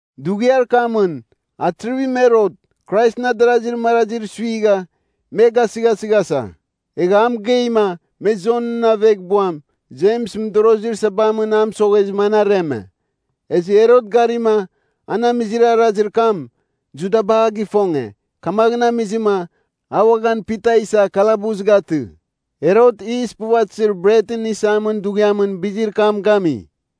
Dughiar kamɨn Atrivim Herot Kraisɨn adarazir marazir suigha me gasɨghasɨghasa. Egha a mɨgeima, me Jonɨn aveghbuam Jems mɨdorozir sabamɨn a mɨsoghezɨma, an areme. Ezɨ Herot garima, an amizir arazir kam, Judaba a gifonge, kamaghɨn amizɨma, a uaghan Pita isa kalabus gatɨ. Herot Yis puvatɨzir Bretɨn Isamin Dughiamɨn bizir kam gami.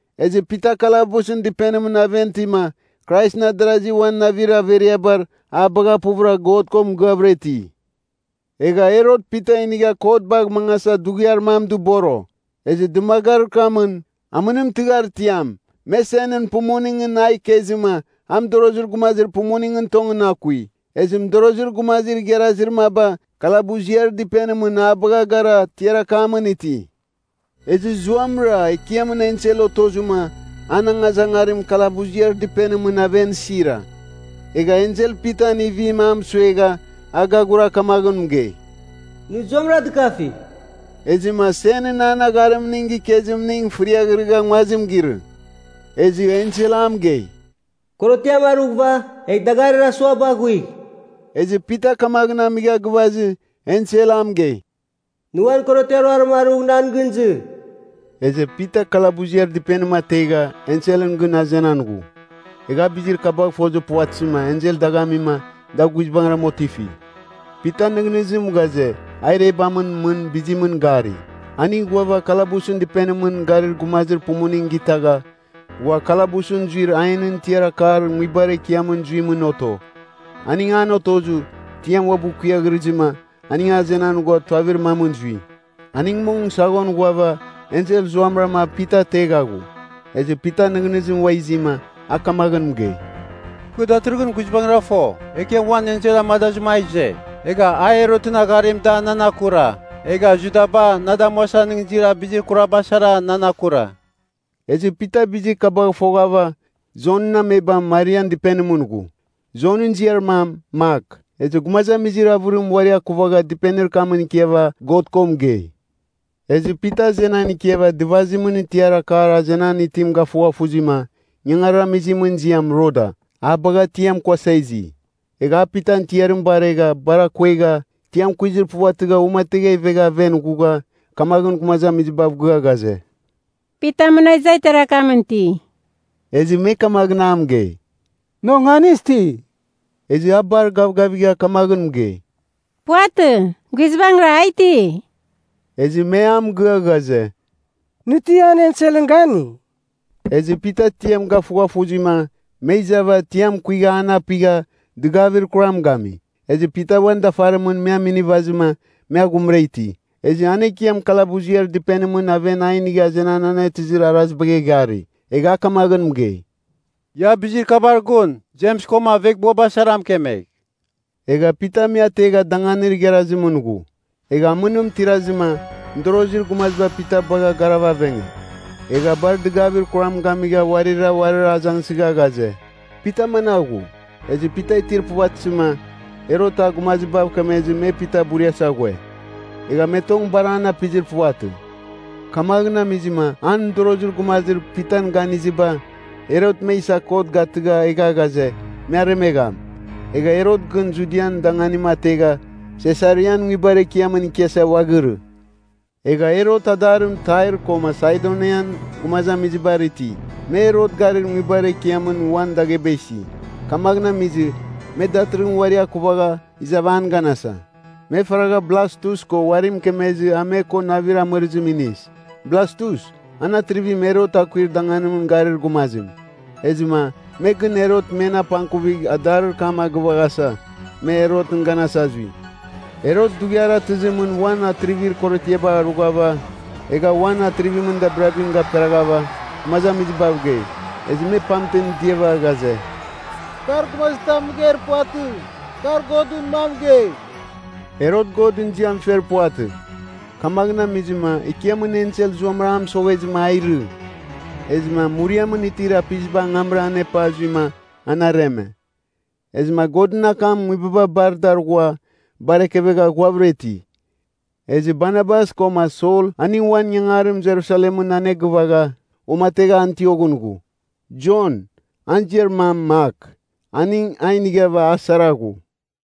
Ezɨ Pita kalabusɨn dɨpenimɨn aven itima Kraisɨn adarasi uan navir averiabar a bagha puvɨra God ko mɨgɨavɨra iti. Egha Herot Pita inigh kot bagh mangasa dughiar mam dɨboro. Ezɨ dɨmagarir kamɨn, amɨnim tɨghar tiam, me senɨn pumuningɨn a ikezɨma a mɨdorozir gumazir pumuningɨn tongɨn akui. Ezɨ mɨdorozir gumazir igharazir maba kalabuziar dɨpenimɨn a bagha gara tiar akamɨn iti. Ezɨ zuamɨra Ekiamɨn ensel otozɨma, an angazangarim kalabuziar dɨpenimɨn aven sira. Egha ensel Pitan ivim a mɨsuegha a gaghura kamaghɨn mɨgei, “Nɨ zuamɨra dɨkafigh!” Ezɨma senɨn an agharimning gikezimning fɨriaghrɨgha nguazim girɨ. Ezɨ ensel a mɨgei, “Korotiam arughɨva, egh dagarir asuabar aghuigh.” Ezɨ Pita kamaghɨn amigha gɨvazɨ ensel a mɨgei, “Nɨ uan korotiar ruarim arugh nan gɨn izɨ.” Ezɨ Pita kalabuziar dɨpenim ategha, enselɨn gɨn azenan ghu. Egha a bizir kabagh fozir puvatɨzɨma, ensel dagh amima, da guizbangɨram otifi. Pitan nɨghnɨzim ghaze, a irebamɨn mɨn bizimɨn gari. Aning ghuava, kalabusɨn dɨpenimɨn garir gumazir pumuning gitagha, ghua kalabusɨn zuir ainɨn tiar akar nguibar ekiamɨn zuimɨn oto. Aning an otozɨ, tiam uabɨ kuiaghrɨzɨma, aning azenan ghua tuavir mamɨn zui. Aning mong saghon ghuava, ensel zuamɨrama Pita ategha ghu. Ezɨ Pitan nɨghnɨzim ua izima, a kamaghɨn mɨgei, “Kɨ datɨrɨghɨn guizbangɨra fo, Ekiam uan ensel amadazɨma a ize. Egha a Herotɨn agharim da nan akura, egha Judaba na damuasa nɨghnɨzir bizir kuraba sara nan akura.” Ezɨ Pita bizir kabagh foghava, Jonɨn amebam Marian dɨpenimɨn ghu. Jonɨn ziar mam Mak. Ezɨ gumazamizir avɨrim uari akuvagha dɨpenir kamɨn ikiava God ko mɨgei. Ezɨ Pita azenan ikiava dɨvazimɨn tiar akar azenan itim gafughafuzima, ingangarir amizimɨn ziam Roda, a bagha tiam kuasa izi. Egha a Pitan tiarim baregha, bar akuegha, tiam kuizir puvatɨgha uamategha ivegha aven ghugha, kamaghɨn gumazamizibav gɨa ghaze, “Pita muna iza tiar akamɨn iti!” Ezɨ me kamaghɨn a mɨgei, “Nɨ onganis ti.” Ezɨ a bar gavgavigha kamaghɨn mɨgei, “Puvatɨ. Guizbangɨra a iti.” Ezɨ me a mɨgɨa ghaze, “Nɨ ti an enselɨn gani.” Ezɨ Pita tiam gafughafuzima, me izava tiam kuigha an apigha, dɨgavir kuram gami. Ezɨ Pita uan dafarimɨn me aminivazɨma, me aghumra iti. Ezɨ an Ekiam kalabuziar dɨpenimɨn aven a inigha azenan anetɨzir arazibagh eghari. Egha a kamaghɨn mɨgei, “Ia bizir kabar gun Jems koma aveghbuaba sara mɨkemegh.” Egha Pita me ategha danganir igharazimɨn ghu. Egha amɨnim tirazɨma, mɨdorozir gumaziba Pita bagh garava avenge. Egha bar dɨgavir kuram gamigha uarira uarir azangsɨgha ghaze, “Pita managh ghu?” Ezɨ Pita itir puvatɨzɨma, Herot a gumazibav kemezɨma me Pita buriasa ghue. Egha me tong bar an apizir puvatɨ. Kamaghɨn amizɨma an mɨdorozir gumazir Pitan ganiziba, Herot me isa kot gatɨgha egha ghaze, me aremegham. Egha Herot gɨn Judian danganim ategha, Sesarian nguibar ekiamɨn ikiasa uaghirɨ. Egha Herot adarim Tair koma Saidonian gumazamizibar iti. Me Herot garir nguibar ekiamɨn uan dagheba isi, kamaghɨn amizɨ, me datɨrɨghɨn uari akuvaghav izav an ganasa. Me faraghav Blastus ko uari mɨkemezɨ a me ko navir amɨrɨzim inis. Blastus, an Atrivim Herot akuir danganimɨn garir gumazim. Ezɨma, me gɨn Herot men apangkuvigh adarir kam a gɨvaghasa, me Herotɨn ganasa zui Herot dughiar atɨzimɨn uan atrivir korotiaba arughava, egha uan atrivimɨn dabirabim gaperaghava, gumazamizibav gei. Ezɨ me pamtem diava ghaze, “Kar gumazitam mɨgeir puvatɨ. Kar godɨn mam mɨgei.” Herot Godɨn ziam fer puvatɨ, kamaghɨn amizɨma Ekiamɨn ensel zuamɨra a mɨsoghezɨma a irɨ. Ezɨma muriamɨn itir apiziba angamra anepa zuima, an areme. Ezɨma Godɨn akam nguibaba bar dar ghua bar ekevegha ghuavɨra iti. Ezɨ Barnabas koma Sol aning uan ingangarim Jerusalemɨn anegɨvagha, uamategha Antioghɨn ghu. Jon, an ziar mam Mak, aning a inighava a sara ghu.